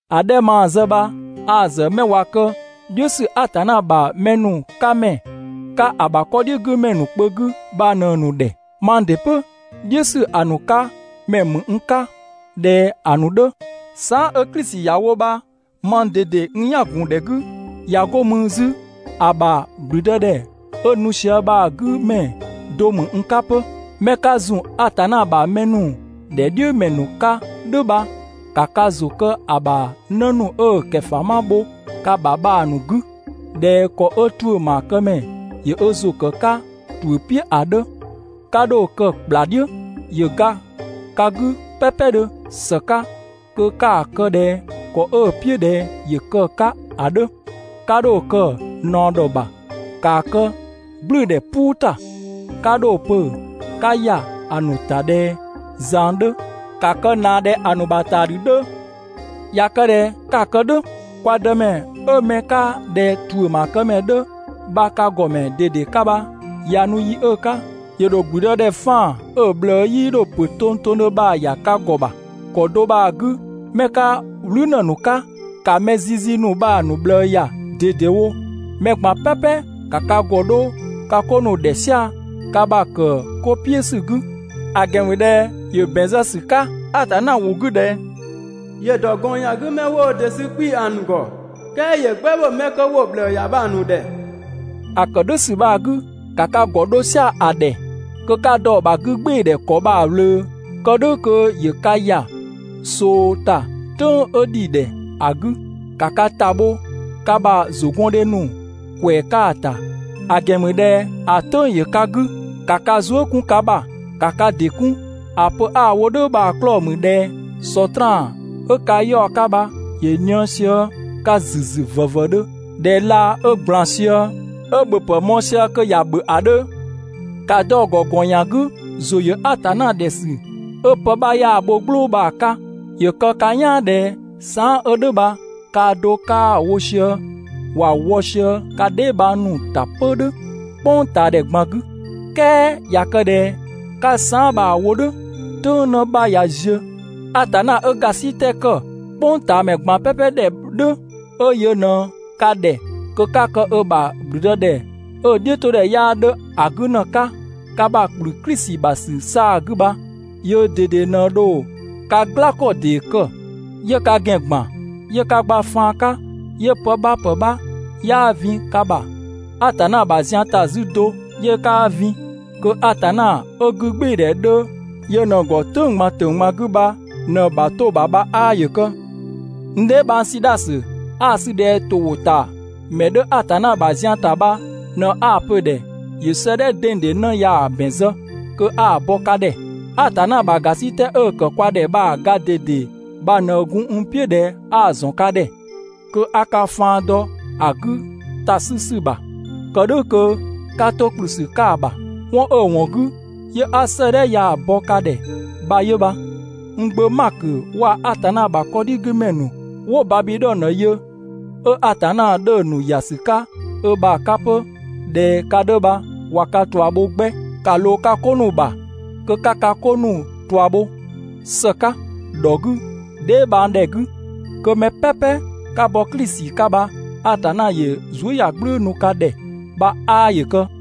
‑A 'dhɛ 'ö maa‑ zë bha a‑ ‑zë 'mɛ ꞊wa kë "dhiʋ̈ ‑sü Atanna ‑bha mɛ ‑nu 'ka ‑mɛ 'ka ‑a ‑bha 'kɔdhigümɛ ‑nu kpö 'gü bha ꞊në‑ ‑nu ‑dhɛ. Mang ‑dɩ 'pö "dhiʋ̈ ‑sü ‑a ‑nu 'ka ‑mɛ ‑mü n 'ka ꞊dhɛ ‑a ‑nu 'dhö, saan" 'ö Klisi ‑ya wo bha mang ꞊dede n "yan ‑gun ‑dhɛ 'gü, ꞊ya 'go mü 'zü ‑a ‑bha ‑gblüdëdhɛ 'ö nu sië bha‑ 'gü ‑mɛ do ‑mü n 'ka 'pö. 'Mɛ 'ka ‑zun Atanna ‑bha mɛ ‑nu ‑dhɛ "dhiʋ̈ ‑mɛ ‑nu 'ka "dhʋ̈ bha ‑ka ka ‑zʋ kë ‑a ‑bha 'në ‑nu 'ö‑ ‑nu ‑kɛfama bho ka ‑bha bha‑ ‑nu 'gü ꞊dhɛ ‑kɔ 'ö ‑tuʋ̈ ‑maakëmɛ ‑yö ö ‑zʋ ‑kë 'ka ‑tuʋ̈ "piʋ̈ ‑a 'dhö, 'ka 'dho‑ kë ‑kpla "dhiʋ̈, ‑yö ga ka 'gü "pɛpɛdhö ‑së 'ka kö 'ka‑ kë ꞊dhɛ ‑kɔ 'ö‑ "piʋ̈ ꞊dhɛ ‑yö kë‑ 'ka ‑a 'dhö. 'Ka 'dho‑ kë ꞊naɔ ‑dhɔ ‑bha, ‑kaa kë "gblʋ̈ʋ̈dhɛ "puu ‑ta. 'Ka 'dho‑ pö 'ka ‑ya ‑a ‑nu ‑ta ꞊dhɛ ꞊zang 'dhö, ‑ka kë ꞊naa ꞊dhɛ ‑a ‑nu ‑bha ‑taadhü 'dhö. ꞊Ya kë ꞊dhɛ 'ka‑ kë "dhʋ̈, kwa Dëmɛ 'ö 'mɛ 'ka ꞊dhɛ ‑tuʋ̈ ‑maakëmɛ 'dhö bha ka ‑gɔmɛ ꞊dede 'ka bha ꞊ya nu yi 'ö‑ 'ka, ‑yö ‑dho ‑gblüdëdhɛ 'faan‑ 'ö‑ ꞊bhlëë 'yii 'dho ‑pö tongtongdhö bha‑ ‑ya ka ‑gɔ ‑bha. ‑Kɔ do bha‑ 'gü 'mɛ 'ka "wlü ‑në ‑nu 'ka, ‑ka mɛ zizi ‑nu bha‑ ‑nu ꞊bhlëë ‑ya ꞊dedewo. Mɛ ꞊gban "pɛpɛ ‑ka ka ‑gɔ 'dho ka 'ko ‑nu ‑dhɛ "sia‑ ka ‑bha ‑kë 'ko "piʋ̈ ‑sü 'gü. ‑A ‑gɛn ‑mü ꞊dhɛ ‑yö ‑bɛn zë ‑sü 'ka Atanna ‑wʋ 'gü ꞊dhɛ ‑yö ‑dɔ ‑gɔn ‑yan 'gü 'mɛ 'wo wo ‑dɩ sü 'kpii‑ ‑a ‑nu ‑gɔ, "kɛɛ ‑yö "gbɛbho 'mɛ 'kö 'wo‑ ꞊bhlëë ‑ya bha‑ ‑nu ‑dhɛ. ‑A ‑kë "dhʋ̈ ‑sü bha‑ 'gü, ‑ka ka ‑gɔ 'dho "sia‑ ‑a ‑dhɛ kö 'ka dɔ‑ ‑bha 'gügbɩɩdhɛ ‑kɔ bha‑ ꞊wlöö kë "dhʋ̈ kö ‑yö ka ‑ya ꞊soo ‑ta "tʋ̈ng 'ö ‑dhi ‑dhɛ ‑a 'gü. ‑Ka ka ‑ta bho ka ‑bha ‑zʋgɔndhe ‑nu ‑kwɛɛ 'ka‑ ‑ta, ‑a ‑gɛn ‑mü ꞊dhɛ ‑a "tʋ̈ng‑ ‑yö ka 'gü. ‑Ka ka zuë" 'kun ka ‑bha. ‑Ka ka ‑dɩ 'kun! ‑A pö 'a‑ wo "dhʋ̈ bha‑ 'klɔɔ‑ ‑mü ꞊dhɛ Sɔtraan 'ö ka 'yaɔ‑ 'ka bha ‑yö ꞊nië sië ka ‑züzü ‑vëvëdhö ꞊dhɛ laa 'ö ꞊gblan sië, 'ö ‑bhöpë mɔɔ‑ sië kö ‑ya ‑bhö ‑a 'dhö. ‑Ka dɔ‑ ‑gɔ ‑gɔn ‑yan 'gü ‑zʋ ‑yö Atanna ‑dhɛ ‑sü 'ö pë 'bha 'yaa‑ bho "gblʋʋ bha‑ 'ka. ‑Yö kë ka "yaan ꞊dhɛ saan" 'ö "dhʋ̈ bha kaa do 'kaa‑ wo sië, ‑wa wɔ sië ka dheebhang ‑nu ‑ta 'pö "dhʋ̈ "kpʋngtaadhɛ ꞊gban 'gü. "Kɛɛ ꞊ya kë ꞊dhɛ 'ka saan" bha‑ wo "dhʋ̈, "tʋ̈ng 'në 'bha ꞊ya ziö, Atanna 'ö ‑gasitɛ ‑kë "kpʋngtaamɛ ꞊gban "pɛpɛ ‑dhɛ "dhʋ̈, 'ö yö ꞊në ka ‑dhɛ kö 'ka kë ö ‑bha ‑gblüdëdhɛ 'ö‑ "dhiʋ̈todhɛ 'yaa 'dhö ‑a 'gü ‑në 'ka, ka ‑bha ‑kplü Klisi ‑bha ‑sü 'saa‑ 'gü bha, yöö ꞊dede ꞊në dho ka "gla ‑kɔ ‑dee kë, 'yö ka ‑gɛn ‑gban, 'yö ka gba faan 'ka 'yö pë 'bha ‑pë 'bha 'yaa vin ka ‑bha Atanna ‑bha zian ‑ta 'zü do 'yö 'kaa vin. Kö Atanna 'ö 'gügbɩɩdhɛ 'dhö yö ꞊në‑ ‑gɔ "tʋ̈ng ꞊gban ‑tʋ̈ng ꞊gban 'gü bha ꞊në‑ ‑bha 'to‑ ‑bha bha 'aa ‑yö kë! N dheebhang Sidhasö 'a‑ 'sü ꞊dhɛ ‑to ‑wʋ ‑ta ‑mɛ 'dhö Atanna ‑bha zian ‑ta bha ꞊në 'a‑ pö‑ ‑dhɛ 'yö 'sëëdhɛ dengdeng 'në ya‑ ‑bɛn zë kö 'a‑ bɔ ka ‑dhɛ. Atanna ‑bha ‑gasitɛ 'ö‑ ‑kë kwa ‑dhɛ bha‑ ga ꞊dede bha ꞊në gun n "piʋ̈ ꞊dhɛ 'a‑ ‑zɔn ka ‑dhɛ, kö 'a ka faan dɔ ‑a 'gü ‑ta 'sü ‑sü ‑bha, kë "dhʋ̈ kö 'ka 'to ‑kplü ‑sü 'ka‑ ‑bha. 'Wɔn 'ö‑ ‑wɔn 'gü 'yö 'a 'sëëdhɛ ya‑ bɔ ka ‑dhɛ bha 'yö bha. N gbö Makö waa‑ Atanna ‑bha 'kɔdhigümɛ ‑nu 'wo Babidhɔnö yö, 'ö Atanna 'dhö‑ ‑nu ‑ya ‑sü 'ka ö ‑bha 'ka 'pö ꞊dhɛ ka 'dhö bha ꞊wa ka ꞊tua bho 'gbɛ. ‑Ka ꞊loo ka 'ko ‑nu ‑bha kö 'ka ka 'ko ‑nu ꞊tua bho ‑së 'ka, ‑dhɔ 'gü, dheebhangdhɛ 'gü. Kö mɛ "pɛpɛ 'ka bɔ Klisi 'ka bha Atanna ‑yö zuëyagblʋ̈ʋ̈‑ nu ka ‑dhɛ bha 'aa ‑yö kë!